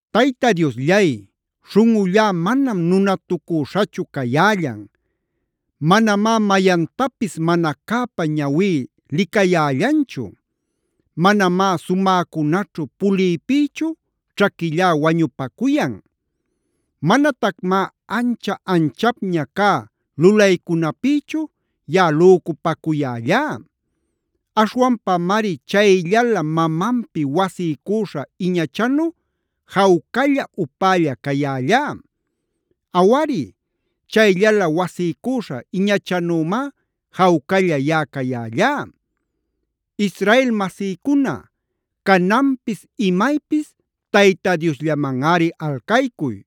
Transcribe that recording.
Tayta Diosllay, śhunꞌullá manam nunatucüśhachu cayällan. Manamá mayantapis mana cäpä ñawí licayällanchu. Manamá sumäcunaćhu puliypïchu ćhaquillá wañupacuyan. Manatacmá ancha-anchapña cä lulaycunapïchu yaꞌa lücupacuyällá. Aśhwanpamari chayllalä mamanpi wasiycüśha iñachanu jawcalla upälla cayällá. Awari, chayllalä wasiycüśha iñachanümá jawcalla yaꞌa cayällá. Israel masïcuna, cananpis imaypis Tayta Diosllamanꞌari alcaycuy.